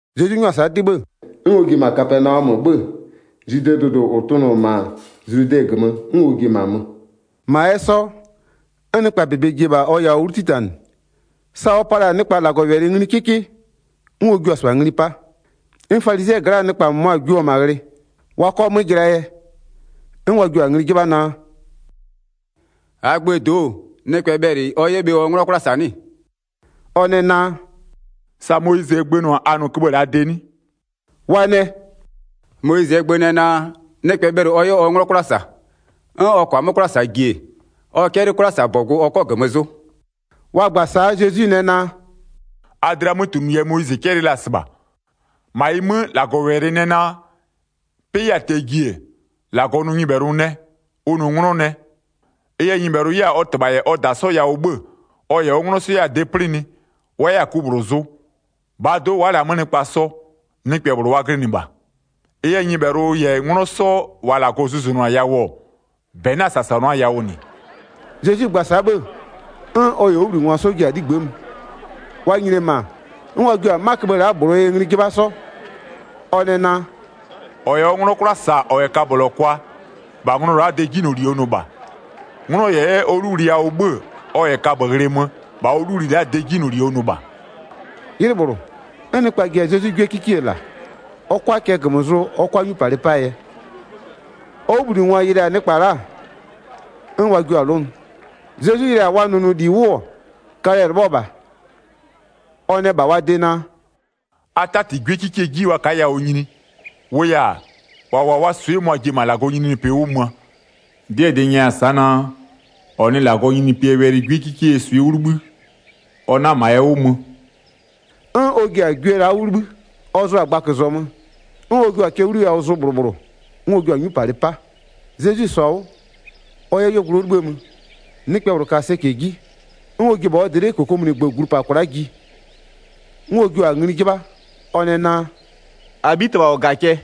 Zezwi 'nyʋa-a sa'a 'dɩ 'bhë, 'n ɔ ji-e -ma Kapɛnaɔmö 'bhö-ö, Zwidee dʋdʋ -ʋ tʋnʋ-ɔ -ma Zludɛ -gömö, 'n ɔ ji-e -ma mö. -Ma 'yɛ 'sɔ, 'n nɩkpaa -bebe ji-e -bha ɔ yawʋ 'wlu 'titanɩ. Sa ɔ pa la-a nɩkpa -Lagɔwɛlɩ ngli 'kɩkɩ, 'n ɔ jua-a -sɩbha ngli 'pa. 'N falizɩɛ gla'aa nɩkpa -mʋmʋa jio-o -ma ghlɩ. Wa 'kɔ 'mö jɩlaa yɛ, 'n wa jio-a ngli 'jɩbha naa: “-Aa gböö do'o, nɩkpɛ bhɛlɩ ɔ 'yɛ bhe ɔ 'nglɔ 'kwla -sa 'nɩ-ɩ?” Ɔ nɛ naa: “Sa Moyizɩɛ gbö nʋ-a a nʋ köbhë -laa de 'nɩ?” Wa nɛ: “Moyizɩɛ gbö nɛ naa: Nɩkpɛ bhɛlɩ ɔ 'yɛ ɔ 'nglɔ 'kwla -sa, 'n ɔ -kɔɔ-a 'mö 'kwla -saa ji-e, ɔ 'cɛlɩ 'kwlasabɔgʋ ɔ 'kɔ -gömö zʋ.” Wa gba-a sa'a Zezwi nɛ naa: “A dlɩaa 'mötunʋ yɛ Moyizɩ 'cɛlɩɩ la-a -sɩbha. 6-Ma ɩ 'mö, -Lagɔwɛlɩ nɛ naa: 'Pɩ 'yɛ-a tɛ-ɛɛ ji-e, -Lagɔ nʋ nyɩbhɛlʋ nɛ, ʋ nʋ 'nglɔ nɛ. Ɩ yɛ nyɩbhɛlʋ 'yɛ-a ɔ -tɩbha -yɛ ɔ -da 'sɔ yawʋ 'bhö-ö, ɔ -yɛ ɔ 'nglɔ 'sɔ 'yɛ-a de 'plɩnɩ, wa 'yɛ-a ku -bhlʋ zʋ, -bhaa do'o wa'a -lɛ-a 'mö nɩkpa sɔ, nɩkpɛ -bhlʋ wa glɩnɩ -bha. Ɩ yɛ nyɩbhɛlʋ -yɛ 'nglɔ 'sɔ -wa -Lagɔ zʋzʋnʋ-a yawʋ-ɔ, -bɛ 'na-a -sasanʋa yawʋ -nɩ.” Zezwi gba-a sa'a 'bhë-ë, 'n ɔ -yɛ ɔ 'wʋbhlinɩngwa 'sɔ ji-a 'ligbë'ë mö. Wa nyini-e -ma, 'n wa jio-a 'ma köbhë la'a -bhlʋɔ yɛ ngli 'jɩbha 'sɔ. Ɔ nɛ naa: “-Ɔ -yɛ ɔ 'nglɔ 'kwla -sa -ɔ -yɛ kabölɔ kwa, -bha nglɔ la'aa de 'jinyloli ɔ nʋ -bha. 'Nglɔ -yɛ 'yɛ ɔ 'luwli yawʋ 'bhö-ö, ɔ -yɛ kaböghlɩ mö, -bha ɔ 'luwli la'aa de 'jinyloli ɔ nʋ -bha.” 'Ylɩ -bhlʋ, 'n nɩkpa ji-a Zezwi 'gwiekikie -la, ɔ 'kʋa cɛ -gömö zʋ ɔ 'kʋa 'nyupalɩ 'paa yɛ. Ɔ 'wʋbhlinɩngwa yɩlɩ-a nɩkpa la'a, 'n wa jua-a 'lʋnʋ. Zezwi yɩlɩ-a wa nʋnʋli 'wʋ-ɔ, kalɛ-ɛ 'lɩbhɔ -bha, ɔ nɛ -bha wa de naa: “A 'tati 'gwiekikie 'ji wa ka'a yawʋ nyini, -wʋʋ yɛ-a, -wa -wʋ-a wa swɩ'ɩ mʋa-a ji-e -ma -Lagɔɔ nyininyinipɩ 'wʋ möö. 'Dɩɛ -dɩ n nyɛya-a sa'a naa, -ɔ nɩ -Lagɔɔ nyininyinipɩɛ wɛlɩ 'gwiekikeyie swɩ'ɩ 'wʋ 'libhï, ɔ 'na -ma ɛ 'wʋ mö.” 'N ɔ ji-a gwie la'a 'wʋ 'libhï, ɔ zʋa-a gbaközɔmö, 'n ɔ jua-a cɛ 'wliyawʋ zʋ -bhlʋ -bhlʋ, 'n ɔ jua-a 'nyupalɩ 'pa. Zezwi -sɔ-a 'wʋ, ɔ 'yɛ 'yuogblʋ 'wʋ 'libhïë mö, nɩkpɛ -bhlʋ ka sɛcɛ 'ji, 'n ɔ ji-e -bha ɔ dlɩ'ɩ -kokomunigbö glu -pa kwla'a ji. 'N ɔ jio-a ngli 'jɩbha, ɔ nɛ naa: “-Abhitɩbha -ɔ -ga cɛ,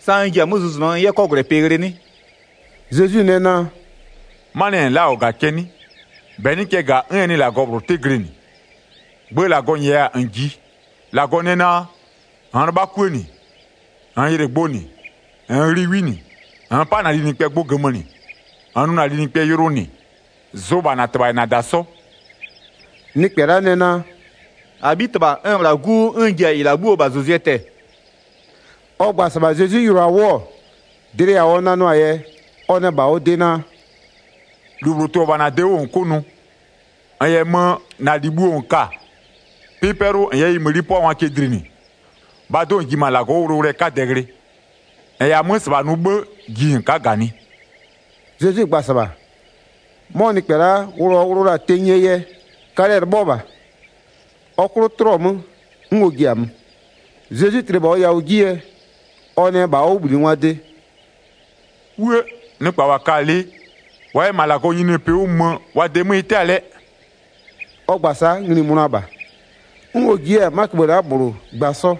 sa n ji-a 'mö zʋzʋnʋɔ n 'yɛ 'kɔgwlɛpɩ ghlɩ 'nɩ?” Zezwi nɛ naa: “'Manɩɛ yɛ -n la'a-a -ɔ -ga cɛ 'nɩ? -Bɛ 'nɩ cɛ -ga, 'n ɛ nɩ -Lagɔ -bhlʋ 'tɩ glɩnɩ. Gbö -Lagɔ -nyɛya-a -n -jiɩ. -Lagɔ nɛ naa: -Nn 'lɩbha 'kuë -nɩ, -nn yɩlɩ gbʋ -nɩ, -nn ghli 'wi -nɩ, -nn 'pa -na linɩkpɛ gbʋ -gömö -nɩ, -nn nʋ -na linɩkpɛ yʋlʋ -nɩ, zʋ -bha -na -tɩbha -yɛ -na -da 'sɔ.” Nɩkpɛ la'a nɛ naa: “-Abhitɩbha, n-n -bhla 'gu 'wʋ, 'n n ji-a -ɩ -la 'bhuoo -bhazʋzʋɛ tɛ-ɛ.” Ɔ gba-a -sɩbha Zezwi yɩlɩɔ-a 'wʋ-ɔ, dlɩ yawʋ ɔ nanɩɔ-aa yɛ, ɔ nɛ -bha ɔ de naa: “-Lu -bhlʋ tʋ-ɔ -bha -na de 'wʋ -n 'kʋ nʋ. -N -yɛ mö, -na -li bhuo -n ka-a, 'pɩ 'pɛlʋ -n 'yɛ ɩ mëni 'pʋangwa cɛ dlinɩ, -bhaa do'o, -n ji -ma -Lagɔ 'wʋ wʋlʋwʋlʋɛ 'kadɛ ghlɩ. -N -yɛ-a 'mö -sɩbha nʋ 'bhë, ji -n ka'a -ganɩ.” Zezwi gba-a -sɩbha, 'mɔ nɩkpɛ la'a wʋlʋ ɔ wʋlʋ la-a tenyie yɛ, kalɛ-ɛ 'lɩbhɔ -bha. Ɔ 'klʋ 'tlɩɔ 'mö 'n ɔ ji-a mö. Zezwi tli-e -bha ɔ yawʋ 'ji yɛ, ɔ nɛ -bha ɔ 'wʋbhlinɩngwaa de: “'Wuë! Nɩkpa -wa ka-a lɩ, wa 'yɛ -ma -Lagɔɔ nyininyinipɩ 'wʋ mö, wa de 'mö ɩ 'tɛ-a lɛ!” Ɔ gba-a sa'a ngli-i mönʋa -bha. 'N ɔ ji 'yɛ-a 'ma wɛlɩköbhë -bhlʋ gba 'sɔ,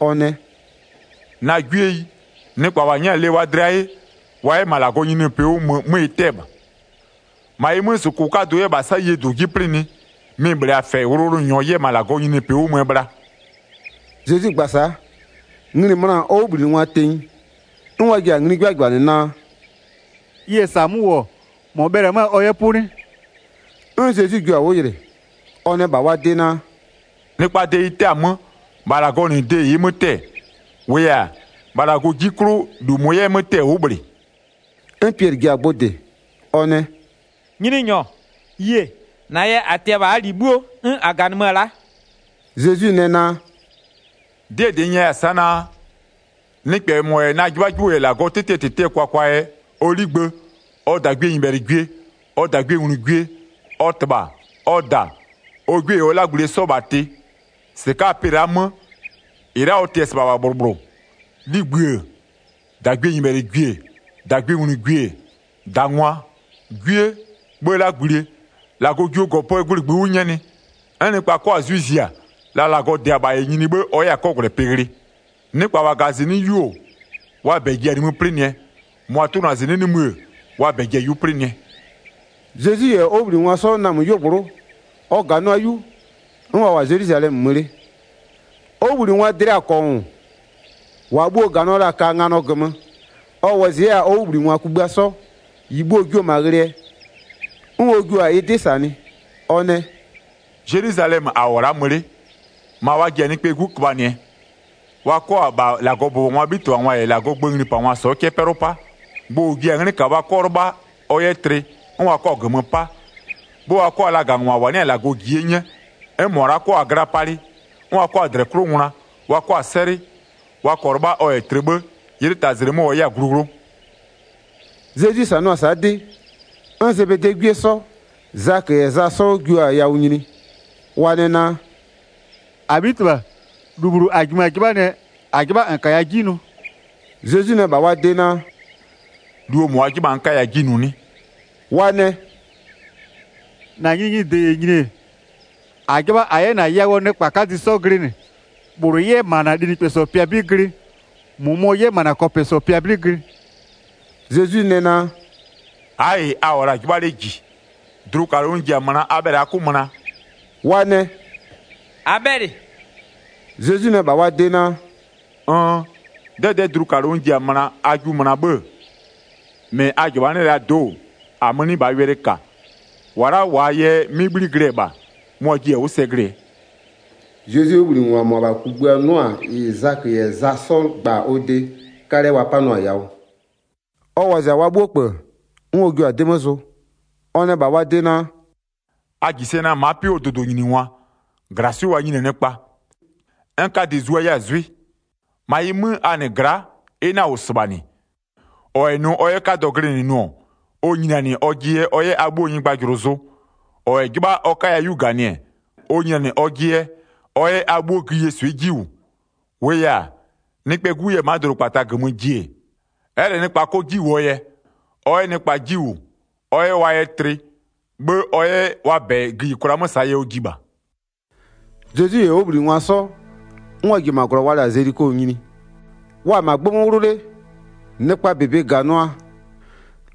ɔ nɛ: “Na 'gwieyi, nɩkpa -wa 'nyɛ-a lɩ wa dlɩa 'ye, wa 'yɛ -ma -Lagɔɔ nyininyinipɩ 'wʋ mö 'mö ɩ 'tɛ-ɛ -bha. 25-Ma ɩ 'mö, -sʋkʋ 'kadʋ 'yɛ -ma 'sayie -dʋ 'mö 'plɩnɩ, mɩ-ɩ -bhlee-a -fɛ wʋlʋwʋlʋnyɔ 'yɛ -ma -Lagɔɔ nyininyinipɩ 'wʋ möö bhla.” Zezwi gba-a sa'a, ngli-i möna-a ɔ 'wʋbhlinɩngwa tenyi, 'n wa ji-a ngli 'jɩbhajɩbhanɩ naa: “Ɩ -yɛ -sa 'mö -wʋ-ɔ, -mɔ bhɛlɩ-ɛ 'mö-a ɔ 'yɛ 'pʋ 'nɩ?” 'N Zezwi jua-a 'wʋ yɩlɩ, ɔ nɛ -bha wa de naa: “Nɩkpaa de ɩ 'tɛ-a 'mö, -bha -Lagɔɔ -nɩ de ɩ'ɩ 'mö 'tɛ-ɛ. -Wʋʋ yɛ-a, -bha -Lagɔɔ 'ji 'klʋ, -lu -mʋ 'yɛ 'mö 'tɛ-ɛ ʋ'ʋ -bhlɩ.” 'N Piɛlɩ ji-a gbʋ -dɩ, ɔ nɛ: “Nyininyɔ, yie, -na yɛ -a tɩ-ɛ -bha -aa -li 'bhuo, 'n -a -ganɩmö-ö la'a.” Zezwi nɛ naa: “'Dɩɛ -dɩ n nyɛya-a sa'a naa, nɩkpɛ -mɔ -yɛ na 'jɩbhajɩbhʋ -yɛ -Lagɔɔ 'tɩtɩɛ -tɩtɩɛ kwakwa yɛ, ɔ 'ligbë, ɔ -dagwienyɩbhɛlɩgwie, ɔ -dagwienglugwie, ɔ -tɩbha, ɔ -da, ɔ 'gwie -yɛ ɔ 'lagblie 'sɔ -bha tɩ, 30-sɩka'aa pɩ la'aa 'mö, -ɩ la'a ɔ tɩ-ɛ -sɩbha -bha -bhlʋ -bhlʋ, 'ligbï-ë, -dagwienyɩbhɛlɩgwie, -dagwienglugwie, -dangwa, 'gwie, 'bhë 'lagblie, -Lagɔ jio -gɔpöö gwlɩ -ngbï 'wʋ 'nyɛnɩ. 'N nɩkpa 'kɔ-a 'zwɩ zia, la -Lagɔ -dɩ-a -bha -yɛ nyini 'bhë ɔ 'yɛ-a 'kɔgwlɛpɩ ghlɩ. Nɩkpa -wa -ga-a -zɩnɩ'ɩ 'yu-o, wa -bɛ ji-a nimï 'plɩnɩɛ, -mʋa tʋnʋ-a -zɩnɩ'ɩ nimï-ë, wa -bɛ ji-a 'yu 'plɩnɩɛ.” Zezwi -yɛ ɔ 'wʋbhlinɩngwa 'sɔ namö 'yuogblʋ'ʋ, ɔ -ganʋa 'yu, 'n wa -wʋ-a Zelwizalɛmö mö 'le. Ɔ 'wʋbhlinɩngwaa dlɩa-a -kɔngʋ, -wa bhuo-o -ganɩɔ la-a ka nganɔ -gömö. Ɔ wɔzɩ 'yɛ-a ɔ 'wʋbhlinɩngwa kugbïa 'sɔ, -ɩ bhuo-o jio-o -ma ghlɩɛ, 'n ɔ jua-a ɩ 'dɩ -sanɩ. Ɔ nɛ: “Zelwizalɛmö -a -wʋ-ɔ la'a mö 'le, -ma wa ji-a Nɩkpɛɛ 'Gu köbhanɩɛ, wa 'kɔ -bha -Lagɔbʋbɔngwaa 'bhitɩbhangwa -yɛ -Lagɔɔ gböö nglipangwa 'sɔ cɛ'ɛ 'pɛlʋ 'pa. Gbʋ -ʋ ji-a 'nglɩ -kaa wa 'kɔ 'lɩbha ɔ 'yɛ tlɩ, 'n wa 'kɔ-a -gömö 'pa. 'Bhë 'n wa 'kɔ-a lagangwa -wa 'nɩ-a -Lagɔ -ji 'ye 'nyɛ. 'N -mʋa la'a 'kɔ-a gla palɩ, 'n wa 'kɔ-a -dlɛ 'klʋ ngwla, wa 'kɔ-a 'sɛlɩ, wa -kɔɔ 'lɩbha ɔ -yɛ tlɩ 'bhë, 'ylɩ taa zlɩ 'mö ɔ 'yɛ-a glu 'wlʋ.” Zezwi -sanʋa-a sa'a 'dɩ, 'n Zebedee 'gwie 'sɔ, Zakö -yɛ Za 'sɔ jio-a yawʋ nyini, wa nɛ naa: “-Abhitɩbha, -lu -bhlʋ -a -jimö-a 'jɩbhanɩɛ, -a 'jɩbha -n -kaya 'ji nʋ.” Zezwi nɛ -bha wa de naa: “-Luo -mʋ a 'jɩbha-a n 'kaya 'ji nʋ 'nɩ?” Wa nɛ: “-Na nyininyinide -yɛ nyini-e, -a 'jɩbha -a 'yɛ -na yawʋɔ nɩkpa 'kadɩ 'sɔ glɩnɩ, -bhlʋ 'yɛ -ma -na linɩkpɛsɔ pɩa 'bɩ glɩ, -mʋmɔ 'yɛ -ma -na kɔpɛsɔ pɩa 'bɩ glɩ.” Zezwi nɛ naa: “A'a -ɩ a -wʋ-ɔ -la 'jɩbha 'le -ji, dlukalʋ n ji-a möna a bhɛlɩ a 'kʋ möna?” Wa nɛ: “-A bhɛlɩ!” Zezwi nɛ -bha wa de naa: “Nn! 'Dɛdɛ'ɛ dlukalʋ n ji-a möna a jiʋ möna 'bhë-ë, 40-mɩ a -jɩbhanɩ'ɩ-ɛ la'aa do'o, -amö 'nɩ -bhaa wɛlɩ -ka. -Wa la'a -waa yɛ 'mɩ 'bhli glɩ-ɛ -bha, mʋa-a jiɩ-a 'wʋ sɛ glɩɛ.” Zezwie 'wʋbhlinɩngwa -mʋabha kugbïa 'nʋ-a -ɩ Zakö -yɛ Za 'sɔ gba-a ɔ de, 'kalɛ wa 'panʋa-a yawʋ. Ɔ wɔzɩ-a wa 'bhuo -kpö, 'n ɔ jua-a 'dɩ mö zʋ, ɔ nɛ -bha wa de naa: “A -ji sɛ naa, ma'a 'pɩ 'wʋɔ dʋdʋnyiningwa, -glaswɩ'ɩ wa nyini-a nɩkpa. 'N 'kadɩ zua 'yɛ-a 'zwɩ. 43-Ma ɩ 'mö, -ma a -nɩ gla'a, ɩ 'na-a -wʋ -sɩbha -nɩ. -Ɔ -yɛ nʋ ɔ 'yɛ 'kadɔ glɩnɩ nʋ-ɔ, ɔ nyinianɩ ɔjɩ yɛ ɔ 'yɛ a 'bhuoo nyɩgbajʋlʋ zʋ. 44-Ɔ -yɛ 'jɩbha ɔ 'kaya 'yu -ganɩ-ɛ, ɔ nyinianɩ ɔjɩ yɛ, ɔ 'yɛ a 'bhuo gïyie swɩ'ɩ 'ji -wʋ. 45-Wʋʋ yɛ-a, Nɩkpɛɛ 'Gu 'yɛ-ɛ ma'a dʋdʋkpata -gömö ji-e, ɛ'ɛ -lɛ wa 'kɔ 'ji -wʋɔ yɛ, ɔ 'yɛ nɩkpa 'ji -wʋ, ɔ 'yɛ wa yɛ tlɩ, 'bhë ɔ 'yɛ wa -bɛ gïyikwla 'mö -saa yɛ ɔ ji -bha.” Zezwi -yɛ ɔ 'wʋbhlinɩngwa 'sɔ, 'n wa ji-e -ma -glɔ wa la-a Zeliko nyini. Wa-a -ma 'gbë 'mö 'wlʋ 'le, nɩkpaa -bebe -ganʋa,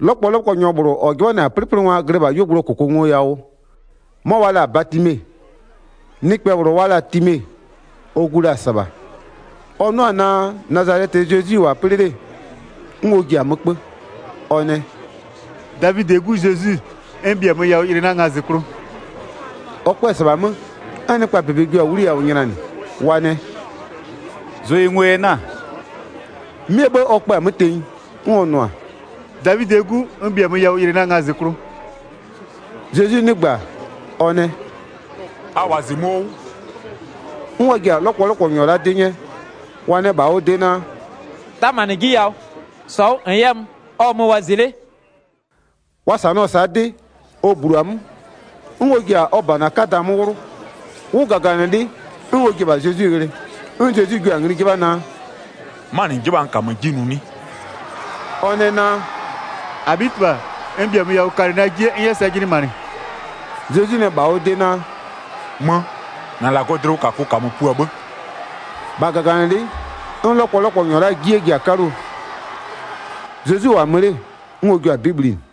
'lɔkpɔlɔkpɔnyɔ -bhlʋ -ɔ 'jɩbhanɩ-a 'plɩplɩngwa glɩ -bha 'yuogblʋɔ -kʋkʋngoyawʋ. 'Mɔ wa la-a Batime, nɩkpɛ -bhlʋ wa la-a Time, ɔ gu la-a -sɩbha. Ɔ 'nʋ-a naa Nazalɛtɩɛ Zezwi -wʋ-a 'plɩ 'le, 'n ɔ ji-a 'mö 'kpö, ɔ nɛ: “Davidɩɛ 'Gu Zezwi, n -bhiamö yawʋ yɩlɩ na ngazɩklʋ!” Ɔ 'kpö-ö -sɩbha 'mö, 'n nɩkpaa -bebe jio-a 'wliyawʋ nylanɩ, wa nɛ: “Zʋ yɩ ngo yɛ 'na-a!” 'Mɩɛ 'bhë ɔ kpö-a 'mö tenyi, 'n ɔ nʋ-a: “Davidɩɛ 'Gu, n -bhiamö yawʋ, yɩlɩ na ngazɩklʋ!” Zezwi 'nɩgbö-a ɔ nɛ: “A -wɔzɩmö'öɔ 'wʋ.” 'N wa ji-a 'lɔkpɔlɔkpɔnyɔ la'a 'dɩ 'nyɛ, wa nɛ -bha ɔ de naa: “'Tamanɩ 'ji yawʋ, -sɔ 'wʋ -n 'yɛ mö, ɔ -wʋmö wɔzɩ 'le.” Wa -sanɩɔ-ɔ sa'a 'dɩ, ɔ -blu-a 'mö, 'n ɔ ji-a ɔ -bana 'kada 'mö 'wlʋ, 'wʋgaganɩlɩ'ɩ 'n ɔ ji-e -bha Zezwi ghlɩ. 'N Zezwi jio-a ngli 'jɩbha naa: “'Manɩ -n 'jɩbha-a n 'yɛ -na de nʋ 'nɩ?” Ɔ nɛ naa: “-Abhitɩbha, n -bhiamö yawʋ kalɩ na 'jie n 'yɛ sɛ jɩnɩmanɩ.” Zezwi nɛ -bha ɔ de naa: “Mö, -na -Lagɔɔ dlɩwʋkakʋ -kamö pua 'bhë.” 53-Bha -gaganɩlɩ'ɩ 'n 'lɔkpɔlɔkpɔnyɔ la'aa 'jie ji-a 'kaluo, Zezwi -wʋ-a mö 'le, 'n ɔ jio-a 'bɩ bhlinɩ.